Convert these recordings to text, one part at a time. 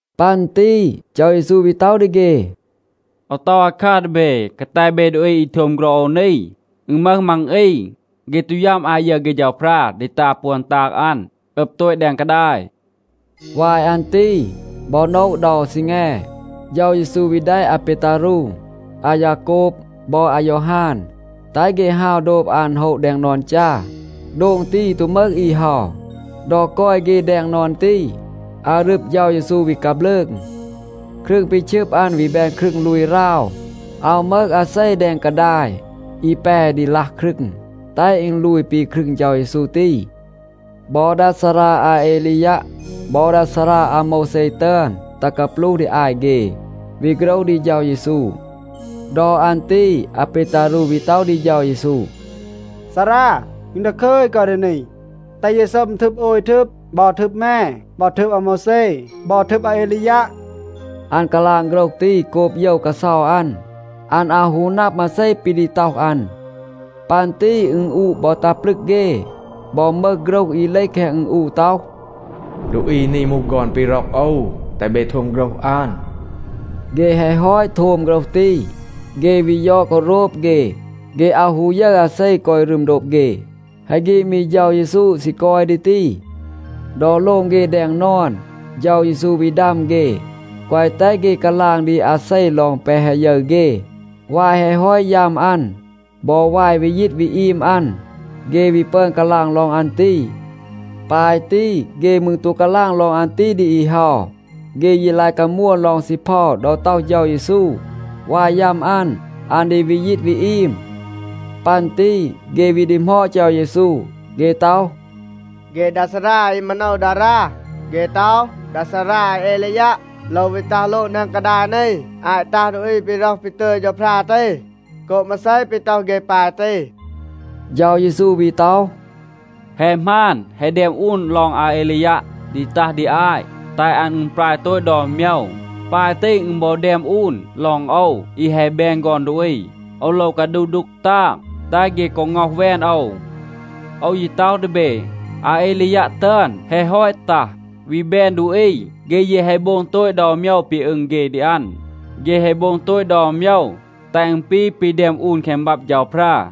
ปัน ตี เฌา เยซู วี ต็อห ดี เฆ, “โอว ต็อห อาคัร ดี เบ. กาแต เบ ดูอี อี โทม โฆรห โอว นี, อึณ มึห มัง อี, เฆ ตู ยัม อาต ยึร เฆ เฌาพรา ดี ตา ปวน ตาง อัน, อึบ โตต แดง กาดาย.” วาย อัน ตี บอ โนะ เดา ซีแง, เฌา เยซู วี แดะ อาเปตารู, อายาโกบ บอ อายอฮาน, แตห เฆ ฮาว โดบ อัน โฮะ แดง นอน จา. โดง ตี ตู มึห อี เฮา. ดอ กอย เฆ แดง นอน ตี, อารึบ เฌา เยซู วี กาบลืง. ครึง ปี ชึบ อัน วี แบน ครึง ลูย ราว. อาว มึห อาเซ แดง กาดาย, อี แป ดี ลัห ครึง, แตห อึณ ลูย ปี ครึง เฌา เยซู ตี. บอ ดา ซารา อาเอลียัะ บอ ดา ซารา อาโมวแซ ตึอน ตัห กาปลูห ดี อาต เฆ, วี โฆรห ดี เฌา เยซู. ดอ อัน ตี อาเปตารู วี ต็อห ดี เฌา เยซู, “ซารา, อึณ ดาคึย กอย ดี นี. แตห เย ซัม ทึบ โอย ทึบ. บอ ทึบ แม, บอ ทึบ อาโมวแซ, บอ ทึบ อาเอลียัะ.” อัน กาลาง โฆรห ตี โกบ โยว กาเซา อัน. อัน อาว ฮู นับ, มาเซ ปี ดี ต็อห อัน. ปัน ตี อึณอูะ บอ ตัห ปลึก เฆ. บอ มึห โฆรห อี เลห แคง อึณอูะ ต็อห, “ดูอี นี มูห ฆอน ปี ร็อก โอว. แตห เบ โทม โฆรห อัน.” เฆ แฮะ ฮอต โทม โฆรห ตี, เฆ วี ยอด กอ โรบ เฆ, เฆ อาว ฮู ยึร อาเซ กอย รึม โดบ เฆ. แฮะ ฆีด มี เฌา เยซู ซี กอย ดี ตี. ดอ โลง เฆ แดง นอน, เฌา เยซู วี ดัม เฆ, แกวะ แตห เฆ กาลาง ดี อาเซ ลอง แปะ แฮะ ยึร เฆ. วาย แฮะ ฮอต ยัม อัน บอ วาย วี ยีต วี อีม อัน, เฆ วี ปึอน กาลาง ลอง อัน ตี. ปาย ตี, เฆ มืร ตู กาลาง ลอง อัน ตี ดี อี เฮา. เฆ ยี ลาย กามวน ลอง ซีเพา ดอ ต็อห เฌา เยซู, วาย ยัม อัน, อัน ดี วี ยีต วี อีม. ปัน ตี เฆ วี ดีหมอด เฌา เยซู. เฆ ต็อห, “เฆ ดา ซารา อี มาโนว ดารา, เฆ ต็อห, ดา ซารา อาเอลียัะ โลว วี ตัห โลง แดง กาดาย นี อาต ตัห ดูอี ปี ร็อห ปี ตึย เฌาพรา ตี. โกบ มาเซ ปี ต็อห เฆ ปาย ตี?” เฌา เยซู วี ต็อห, “แฮะ หมาน. แฮะ แดม อูน ลอง อาเอลียัะ ดี ตัห ดี อาต, แตห อัน อึณปราย โตต ดอน โมยว. ปาย ตี อึณ บอ แดม อูน ลอง โอว, อี แฮะ แบน ฆอน ดูอี, โอว โลว กาดูห ดูก ตาง, แตห เฆ กอ ง็อห แวน โอว. โอว ยี ต็อห ดี เบ, อาเอลียัะ ตึอน แฮะ ฮอต ตัห, วี แบน ดูอี. เฆ ยี แฮะ โบง โตต ดอน โมยว ปี อึง เฆ ดี อัน. เฆ แฮะ โบง โตต ดอน โมยว, แตห อึณ ปี ปี แดม อูน แคง บับ เฌาพรา.”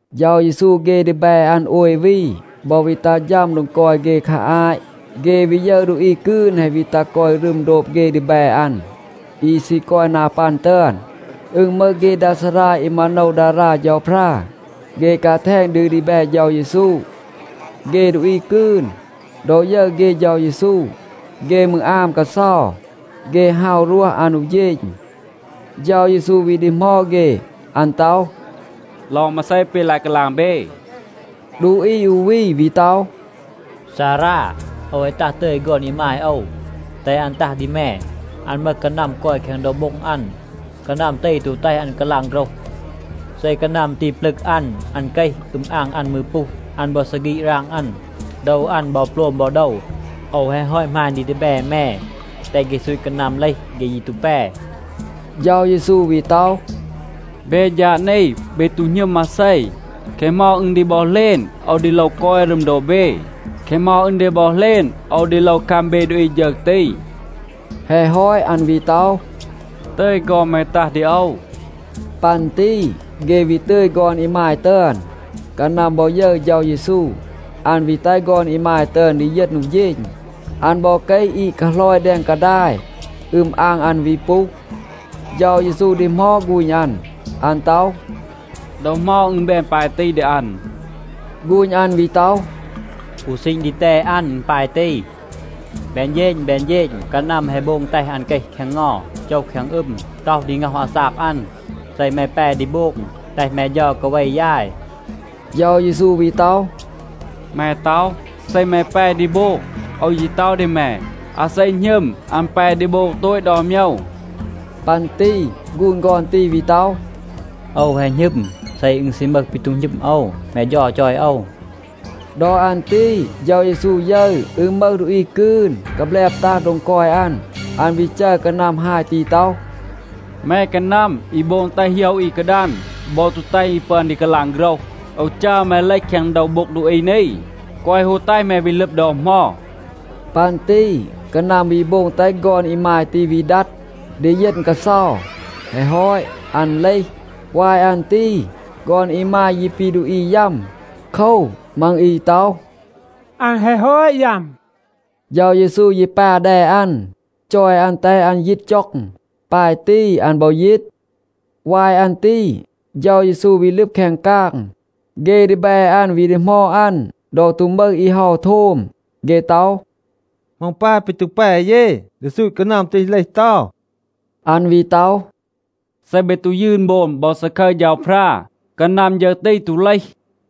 เฌา เยซู เฆ ดีแบ อัน โอย วี บอ วี ตัห ฌัม โดง กอย เฆ คา อาต. เฆ วี ยึร ดูอี กืน แฮะ วี ตัห กอย รึม โดบ เฆ ดีแบ อัน อี ซี กอย นา ปัน ตึอน. อึณ มึห เฆ ดา ซารา อี มาโนว ดารา เฌาพรา, เฆ กาแทณ ดี ดีแบ เฌา เยซู. เฆ ดูอี กืน, ดอ ยึร เฆ เฌา เยซู, เฆ มืร อาม กาเซา. เฆ ฮาว รวห อัน อู เฌณ. เฌา เยซู วี ดีหมอด เฆ. อัน ต็อห, “ลอง มาเซ ปี ลาย กาลาง เบ?” ดูอี อู วี วี ต็อห, “ซารา, โอว แฮะ ตัห ตึย ฆอน อีมาย โอว, แตห อัน ตัห ดี แม. อัน มึห กานัม กอย แคง โดว โบ็ง อัน. กานัม ตี ตู แตห อัน กาลาง โฆรห. เซ กานัม ตี ปลึก อัน, อัน เกห. อึม อาง อัน มืร ปูห. อัน บอ ซีฆีด หราง อัน. โดว อัน บอ โปลม บอ โดว. โอว แฮะ ฮอต หมาณ ดี ดีแบ แม, แตห เฆ ซูต กานัม เลห. เฆ ยี ตู แป.” เฌา เยซู วี ต็อห, “เบ ฌาด นี, เบ ตู หณึม มาเซ. แคะ เหมา อึณ ดี บอ เหลณ, โอว ดี โลว กอย รึม โดบ เบ? แคะ เหมา อึณ ดี บอ เหลณ, โอว ดี โลว คัม เบ ดูอี ฌึร ตี?” แฮะ ฮอต, อัน วี ต็อห, “ตึย ฆอน แม ตัห ดี โอว.” ปัน ตี เฆ วี ตึย ฆอน อีมาย ตึอน. กานัม บอ ยึร เฌา เยซู, อัน วี แตห ฆอน อีมาย ตึอน ดีเยณ อู เฌณ. อัน บอ เกห อีด กาหลอย แดง กาดาย, อึม อาง อัน วี ปูห. เฌา เยซู ดีหมอด ฆูณ อัน. อัน ต็อห, “ดอ เหมา อึณ แบน ปาย ตี ดี อัน?” ฆูณ อัน วี ต็อห, “อู ซีณ ดีแตด อัน อึณ ปาย ตี. แบน เฌณ แบน เฌณ กานัม แฮะ โบง แตห อัน เกห แคง เงา, โจห แคง อึม, ต็อห ดี ง็อห อาซาก อัน. เซ แม แป ดี โบง, แตห แม เฌา กาเว ยาย.” เฌา เยซู วี ต็อห, “แม ต็อห, ‘เซ แม แป ดี โบง.’ โอว ยี ต็อห ดี แม, อาเซ หณึม, อัน แป ดี โบง โตต ดอน โมยว.” ปัน ตี ฆูณ ฆอน ตี วี ต็อห, “โอว แฮะ หณึม. เซ อึณ ซี มึห ปี ตู หณึม โอว, แม เฌา จอย โอว.” ดอ อัน ตี เฌา เยซู ยึร, อึณ มึห ดูอี กืน, กาแบลบ ตัห โดง กอย อัน. อัน วี จัร กานัม ฮาย ตี ต็อห, “แม กานัม อี โบง แตห โหยะ อี กาดัน บอ ตู แตห อี ปึอน ดี กาลาง โฆรห, โอว จัร แม เลห แคง โดว โบ็ง ดูอี นี, แกวะ ฮู แตห แม วี ลึบ ดอ เหมา.” ปัน ตี กานัม วี โบง แตห ฆอน อีมาย ตี วี ดัด, ดีเยณ กาเซา. แฮะ ฮอต, อัน เลห. วาย อัน ตี ฆอน อีมาย ยี ปี ดูอี ยัม. โคว, มัง อี ต็อห, “อัน แฮะ ฮอต ยัม.” เฌา เยซู ยี ปา แด อัน, จอย อัน แตห อัน ยีต จ็อง. ปาย ตี, อัน บอ ยีต. วาย อัน ตี เฌา เยซู วี ลึบ แคง กาง. เฆ ดีแบ อัน วี ดีหมอด อัน ดอ ตู มึห อี เฮา โทม. เฆ ต็อห, “เหมา อึณ ปาย ปี ตู แป เย ดี ซูต กานัม ตี เลห เตา?” อัน วี ต็อห, “เซ เบ ตู ยืน โบม บอ ซาคึร เฌาพรา, กานัม ฌึร ตี ตู เลห.”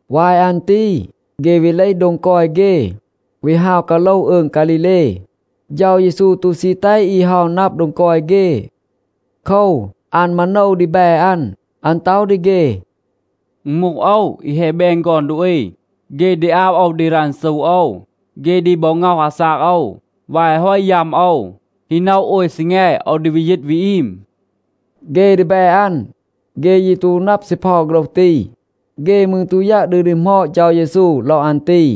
วาย อัน ตี เฆ วี เลห โดง กอย เฆ, วี ฮาว กาโลห อืง ฆาลีเล. เฌา เยซู ตู ซี แตห อี เฮา นับ โดง กอย เฆ. โคว, อัน มาโนว ดีแบ อัน. อัน ต็อห ดี เฆ, “อึณ มูห โอว, อี แฮะ แบน ฆอน ดูอี, เฆ ดี อาบ โอว ดี รันซู โอว. เฆ ดี บอ ง็อห อาซาก โอว. วาย แฮะ ฮอต ยัม โอว, ฮี โนะ โอย ซีแง, โอว ดี วี ยีต วี อีม.” เฆ ดีแบ อัน, เฆ ยี ตู นับ ซีเพา โฆรห ตี. เฆ มืร ตู ยัะ ดี ดีหมอด เฌา เยซู ลอง อัน ตี.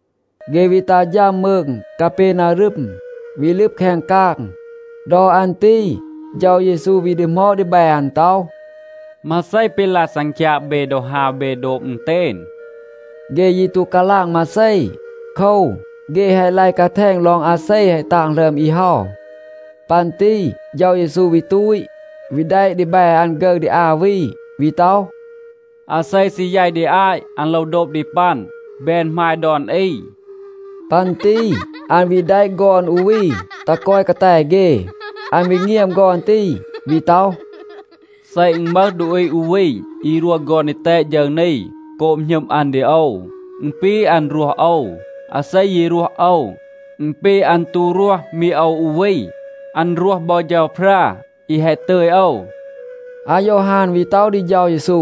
เฆ วี ตัห ฌัม มืง กาเปนารึม, วี ลึบ แคง กาง. ดอ อัน ตี เฌา เยซู วี ดีหมอด ดีแบ อัน ต็อห, “มาเซ ปี ลาย ซังคยาง เบ ดอ ฮาว เอ โดบ อึณเตณ?” เฆ ยี ตู กาลาง มาเซ. โคว, เฆ แฮะ ลาย กาแทณ ลอง อาเซ แฮะ ตาง หลึอม อี เฮา. ปัน ตี เฌา เยซู วี ตูต, วี แดะ ดีแบ อัน ฆึร ดี อา วี, วี ต็อห, “อาเซ ซี แยต ดี อาต, อัน โลว โดบ ดี ปัน, แบน หมาย ดอน อี.” ปัน ตี อัน วี แดะ ฆอน อู วี ตัห กอย กาแต เฆ. อัน วี เงียม ฆอน ตี, วี ต็อห, “เซ อึณ มึห ดูอี อู วี อี รวห ฆอน ดีแตด ฌึร นี โกบ หณึม อัน ดี โอว, อึณ ปี อัน รวห โอว. อาเซ ยี รวห โอว, อึณ ปี, อัน ตู รวห มี โอว อู วี. อัน รวห บอ เฌาพรา อี แฮะ ตึย โอว.” อายอฮาน วี ต็อห ดี เฌา เยซู,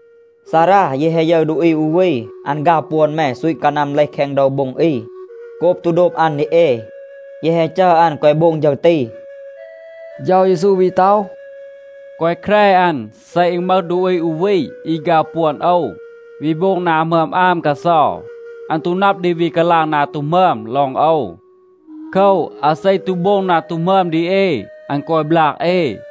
“ซารา, เย แฮะ ยึร ดูอี อู วี, อัน ฆาว ปวน แม, ซูต กานัม เลห แคง โดว โบ็ง อี. โกบ ตู โดบ อัน ดี เอ, เย แฮะ จัร อัน แกวะ โบง ฌึร ตี.” เฌา เยซู วี ต็อห, “แกวะ แคร อัน. เซ อึณ มึห ดูอี อู วี อี ฆาว ปวน โอว, วี โบง นา หมึอม อาม กาเซา, อัน ตู นับ ดี วี กาลาง นา ตู หมึอม ลอง โอว. โคว, อาเซ ตู โบง นา ตู หมึอม ดี เอ, อัน กอย บลาก เอ.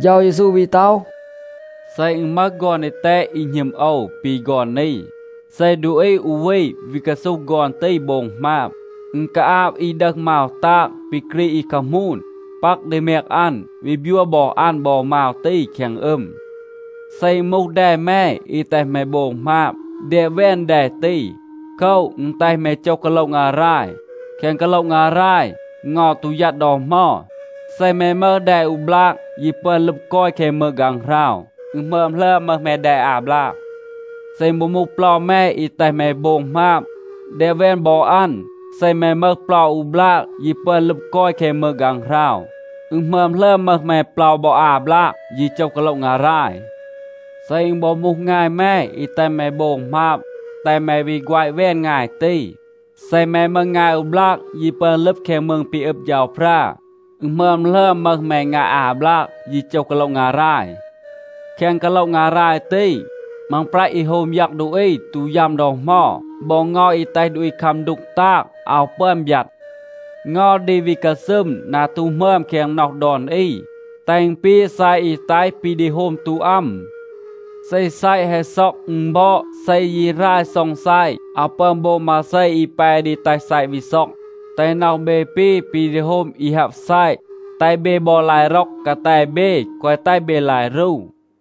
เฌา เยซู วี ต็อห, “เซ อึณ มึห ฆอน ดีแตด อี หณึม โอว ปี ฆอน นี, เซ ดูอี อู วี วี กาซูห ฆอน ตี โบง หมาบ, อึณ กาอาบ อี ดึห มาว ตาง ปี กรีด อี คามูน, ปัก ดี แมง อัน, วี บยัว บอ อัน บอ มาว ตี แคง อึม. เซ อึณ มูห แด แม อี แตห แม โบง หมาบ, แดบ แวน แด ตี. โคว, อึณ แตห แม โจห กาโละ งาราย. แคง กาโละ งาราย เงา ตู ยัด ดอ เหมา. เซ แม มึห แด อู บลาก, ยี ปึอน ลึบ กอย แคง มืง ฆางหราว, อึณ หมึอม หลึอม มึห แม แด อา บลาก. เซ อึณ บอ มูห เปลา แม อี แตห แม โบง หมาบ, แดบ แวน บอ อัน. เซ แม มึห เปลา อู บลาก, ยี ปึอน ลึบ กอย แคง มืง ฆางหราว, อึณ หมึอม หลึอม มึห แม เปลา บอ อา บลาก, ยี โจห กาโละ งาราย. เซ อึณ บอ มูห งาย แม อี แตห แม โบง หมาบ, แตห แม วี แฆวะ แวน งาย ตี. เซ แม มึห งาย อู บลาก ยี ปึอน ลึบ แคง มืง ปี อึบ เฌาพรา, อึณ หมึอม หลึอม มึห แม งาย อา บลาก, ยี โจห กาโละ งาราย. แคง กาโละ งาราย ตี, มังปรัต อี โฮม ยัง ดูอี ตู ยัม ดอ เหมา. บอ เงา อี แตห ดูอี คัม ดูก ตาง อาว ปึอน บยัด. เงา ดี วี กาซึม นา ตู หมึอม แคง น็อห ดอน อี, แตห อึณ ปี ซัยะ อี แตห ปี ดี โฮม ตู อัม. เซ ซัยะ แฮะ ซ็อง, อึณ บอด. เซ ยี หราย ซ็อง ซัยะ, อาว ปึอน โบง มาเซ อี แป ดี แตห ซัยะ วี ซ็อง. แตห น็อห เบ ปี ปี ดี โฮม อี ฮับ ซัยะ. แตห เบ บอ ลาย ร็อก กาแต เบ, แกวะ แตห เบ ลาย รู.”